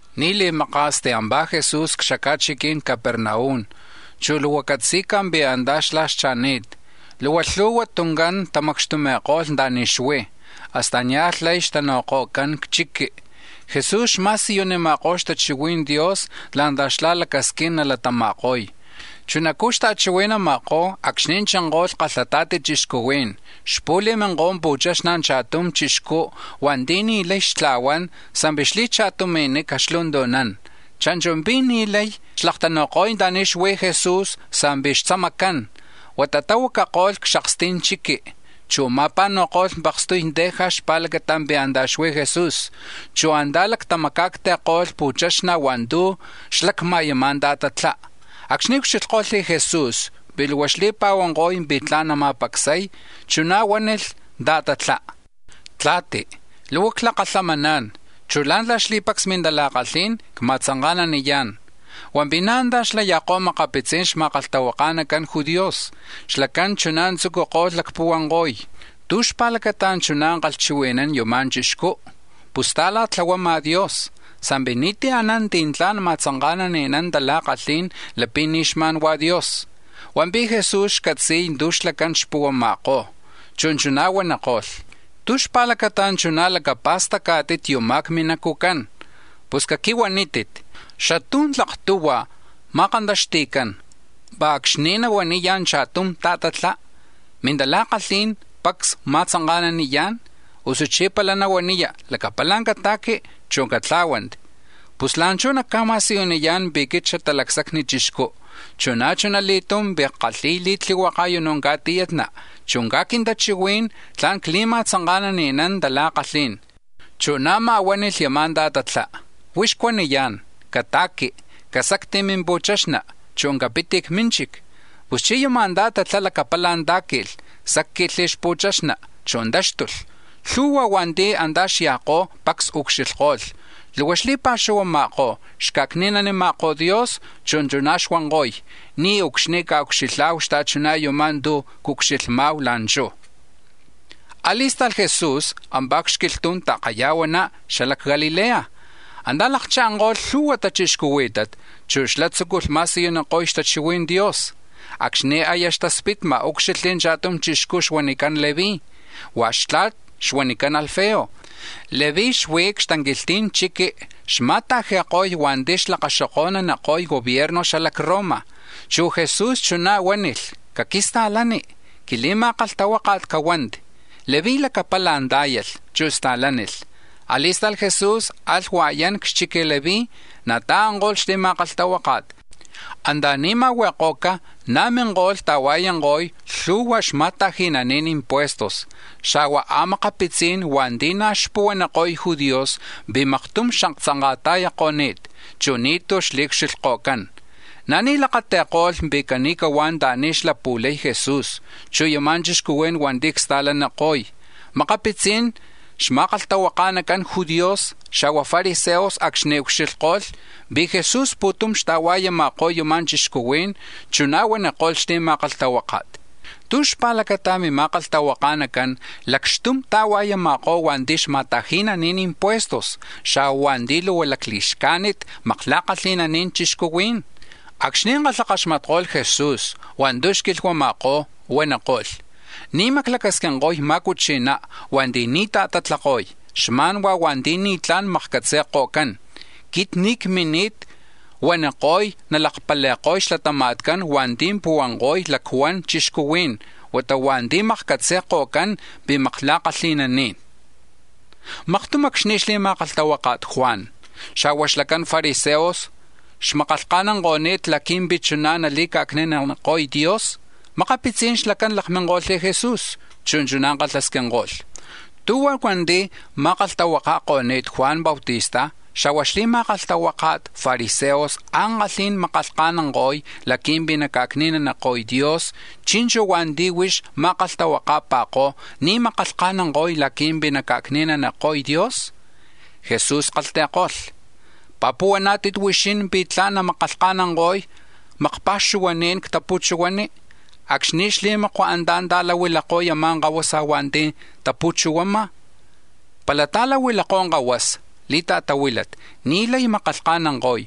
Ni̱ li̱maka̱s tiampá̱ Jesús c-xaca̱chiqui̱n Capernaum, chu̱ lhu̱hua̱ catzi̱ca̱ pi̱ antá̱ xlá̱ xcha̱ni̱t. Luhua lhu̱hua tuncán tamacxtumi̱ko̱lh anta̱ni̱ xuí̱, hasta nia̱lh lay xtanu̱ko̱cán c-chiqui. Jesús xma̱siyunima̱kó̱ xtachihui̱n Dios la̱ntla̱ xlá̱ lacasquín nalatama̱ko̱y. Chunacú̱ xta̱chihui̱nama̱kó̱ acxni̱ chinko̱lh kalhata̱ti chixcuhuí̱n, xpu̱li̱minko̱y pu̱chaxna̱ cha̱tum chixcú̱ hua̱nti̱ ni̱ lay xtla̱huán sa̱mpi̱ xli̱cha̱tumi̱nica̱ xlu̱ntu̱nán. Cha̱nchu̱ pi̱ ni̱ lay xlaktanu̱ko̱y anta̱ni̱ xuí̱ Jesús sa̱mpi̱ xtzamacán, huata tahuacako̱lh c-xaksti̱n chiqui, chu̱ ma̱pa̱nu̱ko̱lh pakstuy teja̱ xpa̱lacata̱ pi̱ antá̱ xuí̱ Jesús, chu̱ antá̱ lacma̱acti̱ko̱lh pu̱chaxna̱ hua̱ntu̱ xlacma̱ yama̱ ta̱tatlá. Acxni̱ ucxilhko̱lh Jesús pi̱ luhua xli̱pa̱huanko̱y pi̱ tla̱n nama̱pacsay, chuná̱ huánilh ta̱tatlá: —Tla̱ti, luhua clakalhamaná̱n, chu̱ la̱ntla̱ xli̱pacs mintala̱kalhí̱n cma̱tzanka̱naniyá̱n. Hua̱mpi̱ na̱ antá̱ xlaya̱kó̱ makapitzi̱n xma̱kalhtahuaka̱nacan judíos, xlacán chuná̱ tzúculh lacpuhuanko̱y: “¿Tú̱ xpa̱lacata̱ chuná̱ kalhchihui̱nán yuma̱ chixcú? Pus ta̱la̱tlahuama̱ Dios; sa̱mpi̱ ni̱tí̱ anán ti̱ tla̱n ma̱tzanka̱nani̱nán tala̱kalhí̱n lapi̱ ni̱ xma̱n Dios.” Hua̱mpi̱ Jesús xcatzi̱y tu̱ xlacán xpuhuama̱kó̱, chu̱ chuná̱ huaniko̱lh: —¿Tú̱ xpa̱lacata chuná̱ lacapa̱stacá̱tit yuma̱ c-minacu̱cán? Pus caquihuanítit, ¿xatú̱ tlak tuhua̱ ma̱kantaxti̱cán, pá̱ acxni̱ nahuaniya̱ cha̱tum ta̱tatlá: ‘Mintala̱kalhí̱n pacs cma̱tzanka̱naniyá̱n’, usuchí̱ pala nahuaniya: ‘Lacapala̱ cata̱qui, chu̱ catlá̱huanti’? Pus la̱nchú̱ nacca̱ma̱siyuniyá̱n pi̱ quit Xatalacsacni Chixcú, chu̱ na̱ chuna li̱tum pi̱ ckalhi̱y li̱tlihuaka̱ u̱nú̱ ca̱tiyatna, chu̱ caj quintachihuí̱n tla̱n cli̱ma̱tzanka̱ni̱nán tala̱kalhí̱n. Chu̱ na̱má̱ huánilh yama̱ ta̱tatlá: —Huix cuaniyá̱n, cata̱qui, casacti̱ mimpu̱chaxna, chu̱ capit c-mínchic. Puschí̱ yama̱ ta̱tatlá̱ lacapala̱ tá̱qui̱lh, sacli̱ xpu̱chaxna, chu̱ táxtulh. Lhu̱hua̱ hua̱nti̱ antá̱ xya̱kó̱ pacs ucxilhko̱lh, luhua xli̱pa̱xuhuama̱kó̱, xca̱cni̱nanima̱kó̱ Dios, chu̱ chuná̱ xuanko̱y: —Niucxni̱ a̱ucxilha̱hu xta̱chuná̱ yumá̱ tu̱ ucxilhma̱hu la̱nchú̱. A̱li̱sta̱lh Jesús ampá̱ c-xquilhtu̱n ta̱kaya̱huaná xala c-Galilea, antá̱ lakcha̱nko̱lh lhu̱hua̱ tachixcuhuí̱tat, chu̱ xlá̱ tzúculh ma̱siyuniko̱y xtachihui̱n Dios. Acxni̱ aya xtaspitma̱, úcxilhli̱ cha̱tum chixcú̱ xuanicán Leví, hua̱ xtla̱t xuanicán Alfeo. Leví xuí̱ c-xtanquilhti̱n chiqui̱ xma̱ta̱ji̱ko̱y hua̱nti̱ xlakaxoko̱naniko̱y gobierno xala c-Roma, chu̱ Jesús chuná̱ huánilh: —Caquista̱lani, quili̱ma̱kalhtahuáka̱t cahuanti. Leví lacapala̱ tá̱yalh, chu̱ sta̱lánilh. A̱li̱sta̱lh Jesús alh hua̱yán c-xchic Leví, na̱ ta̱anko̱lh xli̱ma̱kalhtahuáka̱t. Anta̱ni̱ ma̱hui̱ko̱ca̱ na̱ minko̱lh ta̱hua̱yanko̱y lhu̱hua xma̱ta̱ji̱nani̱n impuestos, xa̱hua̱ a̱makapitzí̱n hua̱nti̱ na̱ xpuhuaniko̱y judíos pi̱ maktum xaktzanka̱ta̱yako̱ni̱t, chu̱ ni̱tú̱ xli̱ucxilhko̱cán. Na̱ ni̱ lakati̱ko̱lh pi̱ cani̱huá̱ anta̱ni̱ xlapu̱lay Jesús, yuma̱ chixcuhuí̱n hua̱nti̱ csta̱laniko̱y. Makapitzi̱n xma̱kalhtahuaka̱nacan judíos, xa̱hua̱ fariseos acxni̱ ucxilhko̱lh pi̱ Jesús pu̱tum xta̱hua̱yama̱kó̱ yuma̱ chixcuhuí̱n, chuná̱ huaniko̱lh xli̱ma̱kalhtahuáka̱t: —¿Tú̱ xpa̱lacata̱ mima̱kalhtahuaka̱nacán lacxtum ta̱hua̱yama̱kó̱ hua̱nti̱ xma̱ta̱ji̱nani̱n impuestos, xa̱huá̱ hua̱nti̱ luhua lacli̱xcajnit makla̱kalhi̱nani̱n chixcuhuí̱n? Acxni̱ kalhakaxmatko̱lh Jesu̱s hua̱ntu̱ xquilhuama̱kó̱, huaniko̱lh: —Ni̱ maclacasquinko̱y ma̱cuchi̱ná̱ hua̱nti̱ ni̱ ta̱tatlako̱y, xma̱n hua̱nti̱ ni̱tlá̱n makcatzi̱ko̱cán. Quit ni̱ cmini̱t huaniko̱y nalakpali̱ko̱y xlatama̱tcán hua̱nti̱ puhuanko̱y lactla̱n chixcuhuí̱n, huata hua̱nti̱ makcatzi̱ko̱cán pi̱ makla̱kalhi̱naní̱n. Maktum acxni̱ xli̱ma̱kalhtahuaka̱t Juan, xa̱hua̱ xlacan fariseos xmakalhkajnanko̱ni̱t laqui̱mpi̱ chuná̱ nali̱ca̱cni̱naniko̱y Dios, makapitzi̱n xlacán lakminko̱lh Jesús, chu̱ chuná̱ kalhasquinko̱lh: —¿Tú̱huan hua̱nti̱ ma̱kalhtahuaka̱ko̱ni̱t Juan Bautista, xa̱hua̱ xli̱ma̱kalhtahuaka̱tcan fariseos ankalhí̱n, makalhkajnanko̱y laqui̱mpi̱ naca̱cni̱naniko̱y Dios, chi̱nchu̱ hua̱nti̱ huix ma̱kalhtahuaka̱pa̱kó̱ ni̱ makalhkajnanko̱y laqui̱mpi̱ naca̱cni̱naniko̱y Dios? Jesús kalhti̱ko̱lh: —¿Pi̱ puhuaná̱tit huixín pi̱ tla̱n namakalhkajnanko̱y makpa̱xuhuaní̱n c-tapu̱chuhuani, acxni̱ xli̱makua̱ antá̱ ta̱lahuilakó̱ yama̱ kahuasa hua̱nti̱ tapu̱chuhuama̱? Pala ta̱lahuilakó̱ kahuasa li̱ta̱tahuílat ni̱ lay namakalhkajnanko̱y,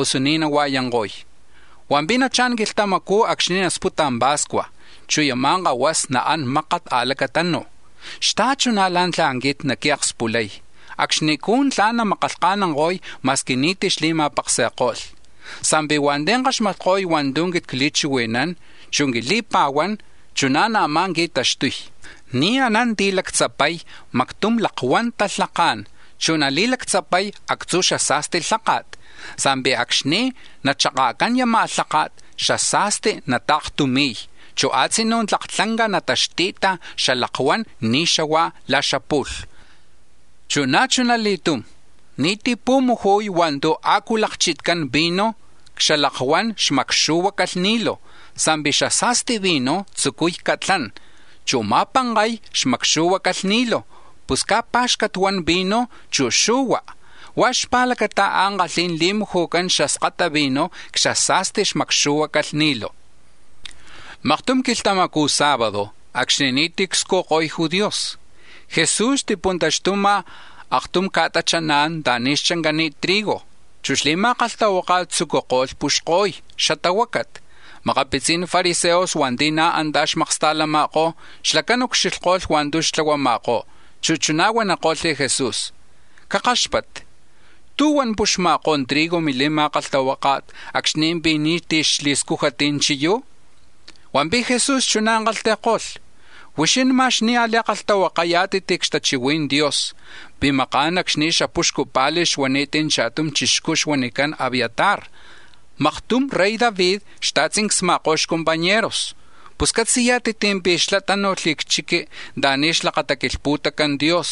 usu ni̱ nahua̱yanko̱y. Hua̱mpi̱ nachá̱n quilhtamacú̱ acxni̱ nasputa̱ pa̱scua̱, chu̱ yama̱ kahuasa naán mákat a̱lacatanu̱ xta̱chuná̱ la̱ntla̱ quit naquiakspulay, acxnicú̱ xlacán namakalhkajnanko̱y ma̱squi ni̱tí̱ xli̱ma̱paksi̱ko̱lh. “Sa̱mpi̱ hua̱nti̱ kaxmatko̱y hua̱ntu̱ quit cli̱chihui̱nán, chu̱ quili̱pa̱huán, chuná̱ na̱má̱ qui̱taxtuy: Ni̱ anán ti̱ lactzapay mactum lakuan talhaká̱n, chu̱ nali̱lactzapay actzu̱ xasa̱sti lháka̱t, sa̱mpi̱ acxni̱ nachaka̱cán yama̱ lháka̱t, xasa̱sti̱ nata̱ktumi̱y, chu̱ a̱tzinú̱ tlak tlanca nataxti̱ta xalakuán ni̱ xahua̱ la̱ xapu̱lh xuani̱t. Chu̱ na̱ chuna li̱tum, ni̱tí̱ pu̱muju̱y hua̱ntu̱ a̱cu lakchitcán vino c-xalakuan xmakxu̱hua calhni̱lu̱, sa̱mpi̱ xasa̱sti vino tzucuy catlán, chu̱ ma̱pankay xmakxu̱hua calhni̱lu̱, pus caj pá̱xcat huan vino, chu̱ xu̱hua. Huá̱ xpa̱lacata ankalhí̱n li̱muju̱cán xaskata vino c-xasa̱sti xmakxu̱hua calhni̱lu̱. Maktum quilhtamacu̱ sábado acxni̱ ni̱tí̱ cscujko̱y judíos, Jesús xti̱puntaxtuma̱ aktum ca̱tachaná̱n anta̱ni̱ xchancani̱t trigo, chu̱ xli̱ma̱kalhtahuáka̱t tzucuko̱lh puxko̱y xtahuácat. Makapitzi̱n fariseos hua̱nti̱ na̱ antá̱ xmaksta̱lama̱kó̱, xlacán ucxilhko̱lh hua̱ntu̱ xtlahuama̱kó̱, chu̱ chuná̱ huaniko̱lh Jesús: —Cakáxpatti, ¿tú̱huan puxma̱kó̱ trigo̱ mili̱ma̱kalhtahuáka̱t acxni̱ pi̱ ni̱tí̱ xli̱scújat chiyú̱? Hua̱mpi̱ Jesús chuná̱ kalhti̱ko̱lh: —Huixín ma̱x ni̱ a̱li̱kalhtahuakayá̱tit c-xtachihui̱n Dios pi̱ maká̱n, acxni̱ xapuxcu pa̱li̱ xuani̱t cha̱tum chixcú̱ xuanicán Abiatar, maktum, rey David xta̱tzincsni̱ma̱kó̱ xcompañeros. Pus catzi̱yá̱tit pi̱ xlá̱ tánu̱lh c-chiqui̱ anta̱ni̱ xlakataquilhpu̱tacán Dios,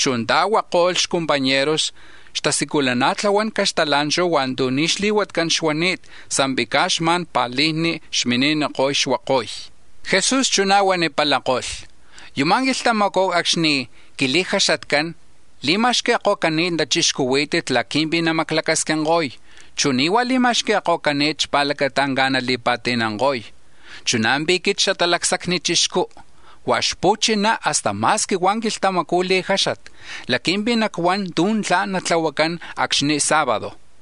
chu̱ ta̱huako̱lh xcompañeros xatasculuna̱tlahuan caxtala̱nchu̱ hua̱ntu̱ ni̱ xli̱huatcán xuani̱t, sa̱mpi̱ caj xma̱n pa̱lijni̱ xmini̱niko̱y xuakoy. Jesús chuná̱ huanipalako̱lh: —Yuma̱ quilhtamacú̱ acxni̱ quili̱jaxatcán li̱ma̱xqui̱ko̱cani̱t tachixcuhuí̱tat laqui̱mpi̱ namaclacasquinko̱y, chu̱ ni̱ huá̱ li̱ma̱xqui̱ko̱cani̱t xpa̱lacata caj nali̱pa̱ti̱nanko̱y. Chuná̱ pi̱ quit Xatalacsacni Chixcú̱, huá̱ xpu̱china hasta ma̱squi hua̱ quilhtamacu̱ li̱jáxat, laqui̱mpi̱ nacuán tu̱ tla̱n natlahuacán acxni̱ li̱jaxat quilhtamacu̱ sábado.